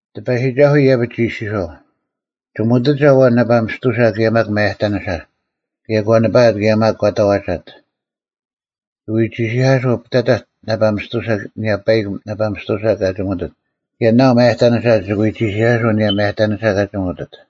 ᑎᐸᔨᒋᒐᓱᐤ ᐃᔭᐱᒡ ᒋ ᐃᔅᒋᔄᐤ, “ᒋᒧᑎᒐ ᐊᐛᓐ ᓇᐸ ᒥᔅᑐᓴ ᑭᔭ ᒪᒃ ᒪᔭᑕᓂᓴ, ᑭᔭ ᒂ ᓂᐸᐊᑦ ᑭᔭ ᒪᒃ ᒂ ᑕᐛᒐᑦ᙮ ᒋᑭ ᐎ ᒋᓯᐧᑲᓱᐤ ᐱᑕᑕᒡ ᓇᐸ ᒥᔅᑐᓴ ᐊᓂᔭ ᐸᐃᒄ ᓇᐸ ᒥᔅᑐᓴ ᑲ ᒋᒧᑎᑦ ᑭᔭ ᓇᐤ ᒪᔭᑕᓂᓴ ᒋᑭ ᐎ ᒋᓯᐧᑲᓱᐤ ᐊᓂᔭ ᒪᔭᑕᓂᓴ ᑲ ᒋᒧᑎᑦ᙮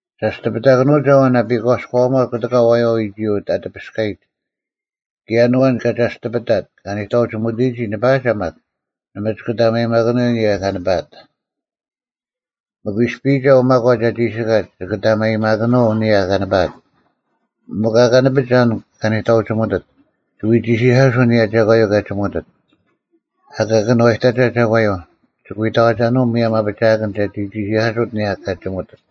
ᒐᔅᑎᐱᑕᑭᓄᒐ ᐊᐛᓐ ᐊᐱᒂᔎᐊᒺᑦ ᑯᑎᑲ ᐊᐛᔪᐛ ᐎᒋᔪᐤ ᐊ ᑎᐱᔅᑲᔨᒡ, ᑭᔭ ᐊᓐ ᐊᐛᓐ ᑲ ᒐᔅᑎᐱᑕᑦ ᑲ ᓂᑕᐅᒋᒧᑎᔨᒋ ᓂᐸᐊᒐ ᒪᒃ, ᓇᒪ ᒋᑭ ᑕᒪᔨᒪᑭᓄᐤ ᐊᓂᔭ ᑲ ᓂᐸᐊᑦ᙮ ᒥᒄ ᐃᔅᐱᔨᒐ ᐅ ᒪᒂᒡ ᐊ ᒋᓯᑲᒡ ᒋᑭ ᑕᒪᔨᒪᑭᓄᐤ ᐊᓂᔭ ᑲ ᓂᐸᐊᑦ᙮ ᒥᒄ ᐊᑲ ᓂᐱᒐ ᐊᓐ ᑲ ᓂᑕᐅᒋᒧᑎᑦ, ᒋᑭ ᐎ ᒋᓯᐧᑲᓱᐤ ᐊᓂᔭ ᒐᒂᔪᐤ ᑲ ᒋᒧᑎᑦ᙮ ᐊᑲ ᑭᓄᐛᔨᑕᒐ ᒐᒂᔪᐤ, ᒋᑭ ᐎ ᑕᐛᒐᓄᐤ ᒧᔭᒻ ᐊᐱᒋᐊᑭᓐ ᒐᒋ ᒋᓯᐧᑲᓱᑦ ᐊᓂᔭ ᑲᒋᒧᑎᑦ᙮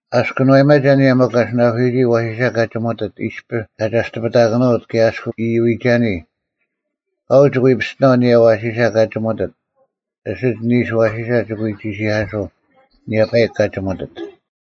ᐊᔅᒄ ᑭᓄᐛᔨᒪᒐ ᐊᓂᔭ ᒥᒄ ᐊᓯᓇᑯᓯᔨᒋ ᐊᐛᓯᓴ ᑲ ᒋᒧᑎᑦ ᐃᔅᐱ ᑲ ᒐᔅᑎᐱᑕᑭᓄᐅᑦ ᑭᔭ ᐊᔅᒄ ᐃᔪᐎᒐᓂ, ᑲᐤ ᒋᑭ ᐎ ᐱᔅᑎᓇᐤ ᐊᓂᔭ ᐊᐛᓯᓴ ᑲ ᒋᒧᑎᑦ ᐊᓯᒡ ᓂᓱ ᐊᐛᓯᓴ ᒋᑭ ᐎ ᒋᓯᐧᑲᓱᐤ ᐊᓂᔭ ᐸᐃᒄ ᑲ ᒋᒧᑎᑦ᙮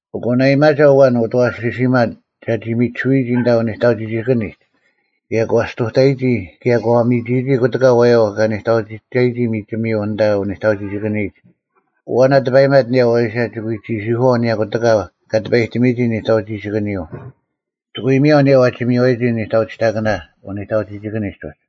ᐊᑯ ᓇᐊᔨᒪᒐ ᐊᐛᓐ ᐅᑦ ᐊᐛᓯᓯᒪ ᒐᒋ ᒥᒋᓱᐎᔨᒋ ᐊᓐᑕ ᐅᓂᑕᐅᒋᒋᑭᓂᒡ, ᑭᔭ ᒂ ᔅᑐᑕᔨᒋ ᑭᔭ ᒂ ᒥᒋᔨᒋ ᑯᑎᑲ ᐊᐛᔪᐛ ᑲ ᓂᑕᐅᒋᑕᔨᒋ ᒥᒋᒥᔪᐤ ᐊᓐᑕ ᐅᓂᑕᐅᒋᒋᑭᓂᔨᒡ, ᐊᐛᓐ ᐊ ᑕᐸᔨᒪᑦ ᐊᓂᔭ ᐊᐛᓯᓴ ᒋᑭ ᐎ ᒋᓯᐧᑯᐛᐤ ᐊᓂᔭ ᑯᑎᑲ ᑲ ᑎᐸᔨᑎᒥᔨᒋ ᓂᑕᐅᒋᒋᑭᓂᔪᐤ, ᒋᑭ ᐎ ᒥᔭᐤ ᐊᓂᔭ ᐛᒋ ᒥᔽᔨᒋ ᓂᑕᐅᒋᑕᑭᓇ ᐅᓂᑕᐅᒋᒋᑭᓂᒡ ᐅᒡ᙮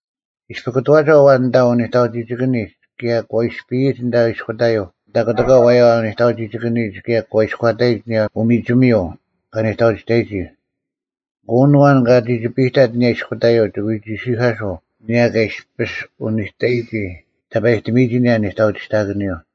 ᐃᔅᐱ ᑯᑐᐛᒐ ᐊᐛᓐ ᐊᓐᑕ ᐅᓂᑕᐅᒋᒋᑭᓂᒡ ᑭᔭ ᒂ ᐃᔅᐱᔨᒡ ᐊᓂᔭ ᐃᔅᑯᑕᔪᐤ ᐊᓐᑕ ᑯᑎᑲ ᐊᐛᔪᐛ ᐅᓂᑕᐅᒋᒋᑭᓂᔨᒡ ᑭᔭ ᒂ ᐃᔎᑕᔨᒡ ᐊᓂᔭ ᐅᒥᒋᒥᔪᐤ ᑲ ᓂᑕᐅᒋᑕᔨᒋ, ᐊᑯ ᐊᓐ ᐊᐛᓐ ᑲ ᒋᒋᐱᔨᑕᑦ ᐊᓂᔭ ᐃᔅᑯᑕᔪᐤ ᒋᑭ ᐎ ᒋᓯᐧᑲᓱᐤ ᐊᓂᔭ ᑲ ᐃᔅᐱᔅ ᐅᓂᑕᔨᒋ ᑕᐸᔨᑎᒥᔨᒋ ᐊᓂᔭ ᓂᑕᐅᒋᒋᑭᓂᔪᐤ᙮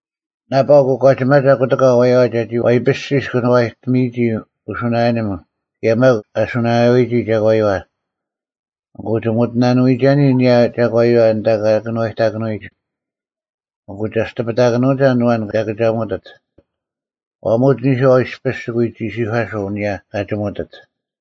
ᓇᐸᐤ ᑯᒂᒋᒪᒐ ᑯᑎᑲ ᐊᐛᔪᐛ ᒐᒋ ᐛᐃᐱᔅᒋᔅ ᑭᓄᐛᔨᑎᒥᔨᒋ ᐅᓱᓇᔭᓂᒻ ᑭᔭ ᒪᒃ ᐊ ᓱᓇᔭᐎᒋ ᒐᒂᔪᐛ᙮ ᐊᑯ ᒋᒧᑎᓇᓄᐎᔨᒐᓂ ᐊᓂᔭ ᒐᒂᔪᐛ ᐊᓐᑕ ᑲ ᑭᓄᐛᔨᑕᑭᓄᐎᒡ, ᐊᑯ ᒐᔅᑎᐱᑕᑭᓄᒐ ᐊᓐ ᐊᐛᓐ ᑲ ᑭᒐᒧᑎᑦ, ᐛᒧᒡ ᓂᔄᐤ ᐃᔅᐱᔅ ᒋᑭ ᐎ ᒋᓯᐧᑲᓱᐤ ᐊᓂᔭ ᑲ ᒋᒧᑎᑦ᙮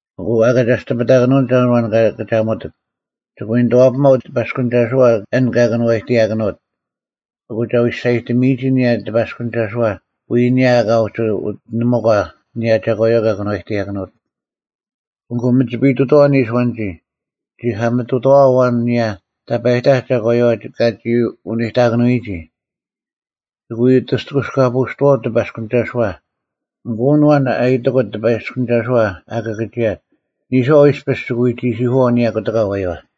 ᐊᑯ ᐊᑲ ᒐᔅᑎᐱᑕᑭᓄᒐ ᐊᓐ ᐊᐛᓐ ᑲ ᑭᒐᒧᑎᑦ, ᒋᑭ ᐎ ᓂᑐᐛᐱᒪᐤ ᑎᐸᔅᑭᓂᒐᓱᐛ ᐊᓐ ᑲ ᑭᓄᐛᔨᑎᔭᑭᓄᐅᑦ, ᐊᑯ ᒐ ᐎ ᒋᔅᒐᔨᑎᒥᔨᒋ ᐊᓂᔭ ᑎᐸᔅᑭᓂᒐᓱᐛ ᐎᔾ ᐊᓂᔭ ᐊᑲ ᐅᒋ ᐅᑎᓂᒧᒂ ᐊᓂᔭ ᒐᒂᔪᐛ ᑲ ᑭᓄᐛᔨᑎᔭᑭᓄᐅᑦ᙮ ᐊᑯ ᒥᒋᐱᔨᑐᑥᐛ ᓂᓱ ᐊᐛᓐᒋ, ᒋᐧᑲᒥᑐᑥᐛ ᐊᐛᓐ ᐊᓂᔭ ᑕᐸᔨᑕᐧᒃ ᒐᒂᔪᐛ ᑲᒋ ᐅᓂᑕᑭᓄᐎᒋ, ᒋᑭ ᐎ ᐅᑎᔅᑯᑲᐳᔅᑐᐛᐅᒡ ᑎᐸᔅᑯᐅᓂᒐᓱᐛ, ᐊᑯ ᐊᓐ ᐊᐛᓐ ᐊ ᐃᔨᑎᑯᑦ ᑎᐸᔅᑯᓂᒐᓱᐛ ᐊ ᑭᑭᒋᔭᑦ, ᓂᔄᐤ ᐃᔅᐱᔅ ᒋᑭ ᐎ ᒋᓯᐧᑯᐛᐤ ᐊᓂᔭ ᑯᑎᒂ ᐊᐛᔪᐛ᙮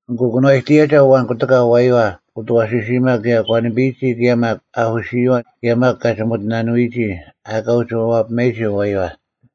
ᐊᑯ ᑭᓄᐛᔨᑎᔭᒐ ᐊᐛᓐ ᑯᑎᒂ ᐊᐛᔪᐛ ᐅᑦ ᐊᐛᓯᓯᒪ ᑭᔭ ᒂ ᓂᐱᔨᒋ ᑭᔭ ᒪᒃ ᐊᐧᑯᓯᔪᐛ ᑭᔭ ᒪᒃ ᑲ ᒋᒧᑎᓇᓄᐎᒋ ᐊᑲ ᐅᒋ ᐛᐱᒪᔨᒋ ᐊᐛᔪᐛ᙮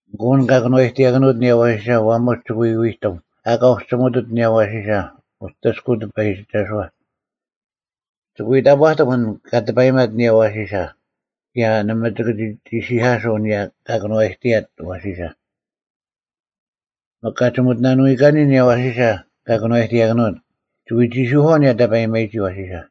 ᐊᑯ ᐊᓐ ᑲ ᑭᓄᐛᔨᑎᐊᑭᓄᐅᑦ ᐊᓂᔭ ᐊᐛᓯᓴ ᐛᒧᒡ ᒋᑭ ᐎ ᐎᑎᒻ ᐊᑲ ᐅᒋ ᒋᒧᑎᑦ ᐊᓂᔭ ᐊᐛᓯᓴ ᐅᑎᔅᑯᐤ ᑎᐸᔨᒋᒐᓱᐛ᙮ ᒋᑭ ᐎ ᑕᑈᑎᒻ ᐊᓐ ᑲ ᑎᐸᔨᒪᑦ ᐊᓂᔭ ᐊᐛᓯᓴ, ᑭᔭ ᓇᒪ ᒋᑭ ᒋ ᒋᓯᐧᑲᑯᐤ ᐊᓂᔭ ᑲ ᑭᓄᐛᔨᑎᔭᑦ ᐊᐛᓯᓴ᙮ ᒥᒄ ᑲ ᒋᒧᑎᓇᓄᐎᒂᓂ ᐊᓂᔭ ᐊᐛᓯᓴ ᑲ ᑭᓄᐛᔨᑎᔭᑭᓄᐅᑦ, ᒋᑭ ᐎ ᒋᓯᐧᑯᐛᐤ ᐊᓂᔭ ᑕᐸᔨᒪᔨᒋ ᐊᐛᓯᓴ᙮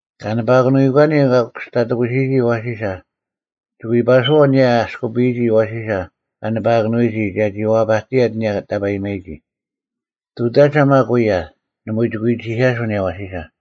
ᑲ ᓂᐸᐃᑯᐎᒂᓂ ᑲ ᑯᔅᑕᑎᑯᓯᔨᒋ ᐊᐛᓯᓴ, ᒋᑭ ᐎ ᐸᓱᐛᐤ ᐊᓂᔭ ᐊᔅᑯᐱᔨᒋ ᐊᐛᓯᓴ ᑲ ᓂᐸᐊᑭᓄᐎᒋ ᒐᒋ ᐛᐸᑎᔭᑦ ᐊᓂᔭ ᑕᐸᔨᒪᔨᒋ᙮ ᑐᑕᒐ ᒪᒃ ᐅᔭ, ᓇᒪ ᒋᑭ ᐎ ᒋᓯᐧᑲᓱᐤ ᐊᓂᔭ ᐊᐛᓯᓴ᙮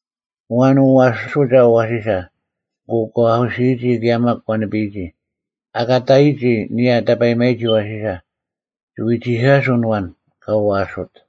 ᐊᐛᓐ ᐅᐛᐊᓱᒐ ᐊᐛᓯᓴ, ᐊᑯ ᒂ ᐊᐧᑯᓯᔨᒋ ᑭᔭ ᒪᒃ ᒂ ᓂᐱᔨᒋ, ᐊᑲ ᑕᔨᒋ ᐊᓂᔭ ᑕᐸᔨᒪᔨᒋ ᐊᐛᓯᓴ, ᒋᑭ ᐎ ᒋᓯᐧᑲᓱᐤ ᐊᓐ ᐊᐛᓐ ᑲ ᐅᐛᐊᓱᐅᑦ᙮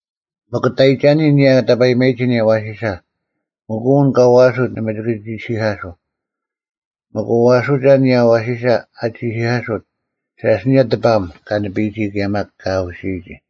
ᒥᒄ ᑕᔨᒐᓂᔾ ᐊᓂᔭ ᑕᐸᔨᒪᔨᒋ ᐊᓂᔭ ᐊᐛᓯᓴ, ᐊᑯ ᐊᓐ ᑲ ᐅᐛᐊᓱᐅᑦ ᓇᒪ ᒋᑭ ᒋᓯᐧᑲᓱᐤ᙮ ᒥᒄ ᐅᐛᐊᓱᒐ ᐊᓂᔭ ᐊᐛᓯᓴ ᐊ ᒋᓯᐧᑲᓱᑦ, ᓴᔅ ᐊᓂᔭ ᑎᐸᐊᒻ ᑲ ᓂᐱᔨᒋ ᑭᔭ ᒪᒃ ᑲ ᐊᐧᑯᓯᔨᒋ᙮”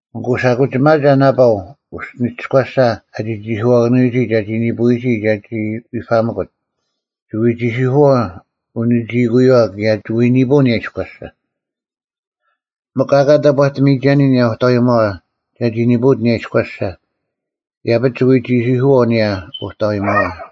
“ᐊᑯ ᓴᐧᑯᒋᒪᒐ ᓇᐸᐤ ᐅᔅᒋᓂᒋᔎᓴ ᐊᒋ ᒋᔅᒋᓄᐛᒋᐊᑭᓄᐎᒋ ᒐᒋ ᓂᐳᐎᒋ ᒐᒋ ᐎᐸᒥᑯᑦ, ᒋᑭ ᐎ ᒋᓯᐧᑯᐛᐤ ᐅᓂᒋᐃᑯᔪᐛ ᑭᔭ ᒋᑭ ᐎ ᓂᐳᐤ ᐊᓂᔭ ᐃᔎᓴ, ᒥᒄ ᐊᑲ ᑕᑈᑎᒥᒐᓂᔾ ᐊᓂᔭ ᐅᑕᐎᒪᐛ ᒐᒋ ᓂᐳᐅᑦ ᐊᓂᔭ ᐃᔎᓴ, ᐃᔭᐱᒡ ᒋᑭ ᐎ ᒋᓯᐧᑯᐛᐤ ᐊᓂᔭ ᐅᑕᐎᒪᐛ᙮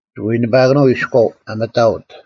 ᒋᑭ ᐎ ᓂᐸᐊᑭᓄᐤ ᐃᔎᐤ ᐊ ᒥᑕᐅᑦ᙮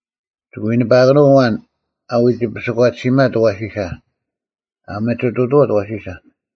ᒋᑭ ᐎ ᓂᐸᐊᑭᓄᐤ ᐊᐛᓐ ᐊ ᐎᒋ ᐱᓯᒂᑎᓯᒪᑦ ᐊᐛᓯᓴ (ᐊ ᒥᒋᑐᑐᐛᑦ ᐊᐛᓯᓴ)᙮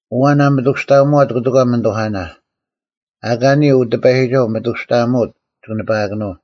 ᐊᐛᓐ ᐊ ᒥᑐᔅᑕᐊᒧᐛᑦ ᑯᑎᑲ ᒥᓂᑐᐧᑲᓇ, ᐊ ᐊᑲ ᓂᔾ ᐅᑎᐸᔨᒋᒐᐤ, ᒥᑐᔅᑕᐊᒧᐅᑦ ᒋᑭ ᓂᐸᐊᑭᓄᐤ᙮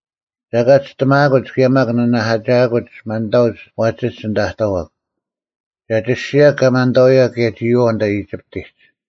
ᒐ ᐊᑲ ᒋᔅᑎᒪᐊᑯᒡ ᑭᔭ ᒪᒃ ᓂᓇᐧᑲᒋᐊᑯᒡ ᒪᓐᑕᐅᒡ ᐛᒋᒡ ᐊᓐᑕ ᐊ ᑕᐛᒄ᙮ ᒐ ᒋᔅᒋᔭᒄ ᑲ ᒪᓐᑕᐅᑯᔭᒃ ᑭᔭ ᒋᔨᐛᐤ ᐊᓐᑕ ᐃᒋᑉᑎᒡ᙮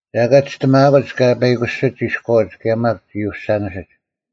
ᒐ ᐊᑲ ᒋᔅᑎᒪᐊᑯᒡ ᑲ ᐸᐃᑯᓯᒡ ᐃᔎᐅᒡ ᑭᔭ ᒪᒃ ᒋᐅᓴᓂᓯᒡ᙮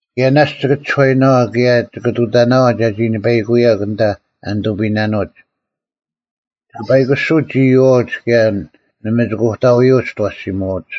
ᑭᔭ ᓇᔅᒡ ᒋᑭ ᒋᔄᐃᓇᐛᐤ ᑭᔭ ᒋᑭ ᑐᑕᑎᓇᐛᐤ ᒐᒋ ᓂᐸᐃᑯᐅᔭᒄ ᐊᓐᑕ ᐊ ᓂᑐᐱᔨᓇᓄᐅᒡ᙮ ᒋᑭ ᐸᐃᑯᓱᐅᒡ ᒋᐅᐛᐅᒡ ᑭᔭ ᓇᒪ ᒋᑭ ᐅᑕᐎᔪᐅᒡ ᒋᑦ ᐊᐛᓯᒧᐛᐅᒡ᙮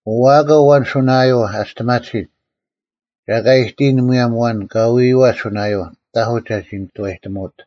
ᐅᐛᐊᒂᐛ ᐊᐛᓐ ᓱᓇᔭᔪᐤ ᐊ ᒋᔅᑎᒪᑎᓯᒡ, ᒐ ᐊᑲ ᐃᑎᔨᓐ ᒧᔭᒻ ᐊᐛᓐ ᑲ ᐎᐃᐛᑦ ᓱᓇᔭᔪᐤ, ᑕᐧᑯᒡ ᒐᒋ ᓂᑐᐛᔨᒧᐅᑦ᙮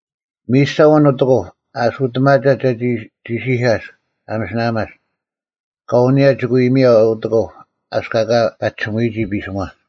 ᒥᔨᔅᒐ ᐊᐛᓐ ᐅᑦ ᐊᑯᑉ ᐊ ᐊᓱᑎᒪᒐᑦ ᒐᒋ ᒋᓯᐧᑲᔅᒃ ᐊ ᒥᓯᓇᐊᒪᔅᒃ, ᑲᐤ ᐊᓂᔭ ᒋᑭ ᐎ ᒥᔭᐛᐤ ᐅᑦ ᐊᑯᑉ ᐊᔅᒃ ᐊᑲ ᐸᒋᓱᒧᐎᒋ ᐱᓯᒧᐛ᙮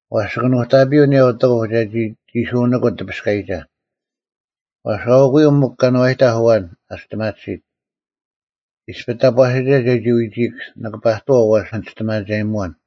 ᐛᔅ ᒋᑭ ᓄᑕᐱᔪᐤ ᐊᓂᔭ ᐅᑦ ᐊᑯᑉ ᒐᒋ ᒋᓱᓂᑯᑦ ᑎᐸᔅᑲᔨᒐ᙮ ᐛᔅ ᐊᐅᑯᔪᐤ ᒥᒄ ᑭᓄᐛᔨᑕᐧᒃ ᐊᐛᓐ ᐊ ᒋᔅᑎᒪᑎᓯᑦ᙮ ᐃᔅᐱ ᑕᑈᓯᒐ ᒐᒋ ᐎᒋᐃᒄ, ᓂᑭ ᐸᑐᐛᐤ ᐛᔅ ᓂ ᒋᔅᑎᒪᒐᔨᒧᐛᓐ᙮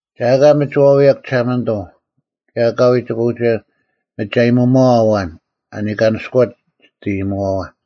ᒐ ᐊᑲ ᒥᒋ ᐛᐎᔭᒄ ᒋᓴᒪᓂᑐᐤ ᑭᔭ ᐊᑲᐎᔾ ᒋᑭ ᐅᒋ ᒥᒋ ᐊᔨᒧᒪᐛᐤ ᐊᐛᓐ ᐊ ᓂᑲᓂᔅᑯᐛᑦ ᒋᑦ ᐃᔨᒧᐛᐛ᙮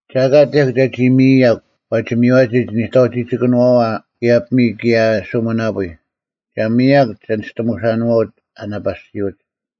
ᒐ ᐊᑲ ᑎᔭᒄ ᒐᒋ ᒥᔨᔭᒄ ᐛᒋ ᒥᔽᒋ ᒋᓂᑕᐅᒋᒋᑭᓄᐛᐛ ᑭᔭ ᐱᒥᔾ ᑭᔭ ᓱᒥᓇᐳᐎᔾ᙮ ᒐ ᒥᔨᔭᒄ ᒋᓂᔅᑎᒧᓴᓄᐛᐅᒡ ᐊ ᓇᐸᓯᐅᒡ᙮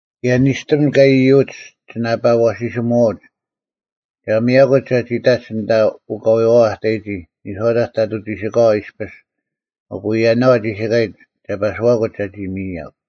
ᑭᔭ ᓂᔅᑎᒻ ᑲ ᐃᔪᐅᒡ ᒋᓇᐸ ᐊᐛᓯᓯᒧᐛᐅᒡ᙮ ᒐ ᒥᔭᑯᒡ ᒐᒋ ᑕᒡ ᐊᓐᑕ ᐅᑲᐎᐛᐛ ᐊ ᑕᔨᒋ ᓂᔄᐅᑕᒡ ᑕᑐᐤ ᒋᓯᑲᐛ ᐃᔅᐱᔅ ᐊᑯ ᔭᓇᐤ ᐊ ᒋᓯᑲᔨᒡ ᒐ ᐸᓯᐛᑯᒡ ᒐᒋ ᒥᔨᔭᒄ᙮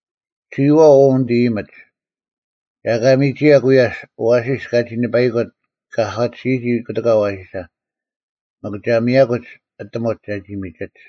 ᒋᔨᐛᐤ ᐅ ᓂᑦ ᐃᔨᒥᒡ, ᒐ ᐊᑲ ᒥᒋᔭᒄ ᐎᔭᔅ ᐊᐛᓯᔅ ᑲᒋ ᓂᐸᐃᑯᑦ ᑲ ᐊᒂᑎᓯᒋ ᑯᑎᑲ ᐊᐛᓯᓴ, ᒥᒄ ᒐ ᒥᔭᑯᒡ ᐊᑎᒧᒡ ᒐᒋ ᒥᒋᒡ᙮”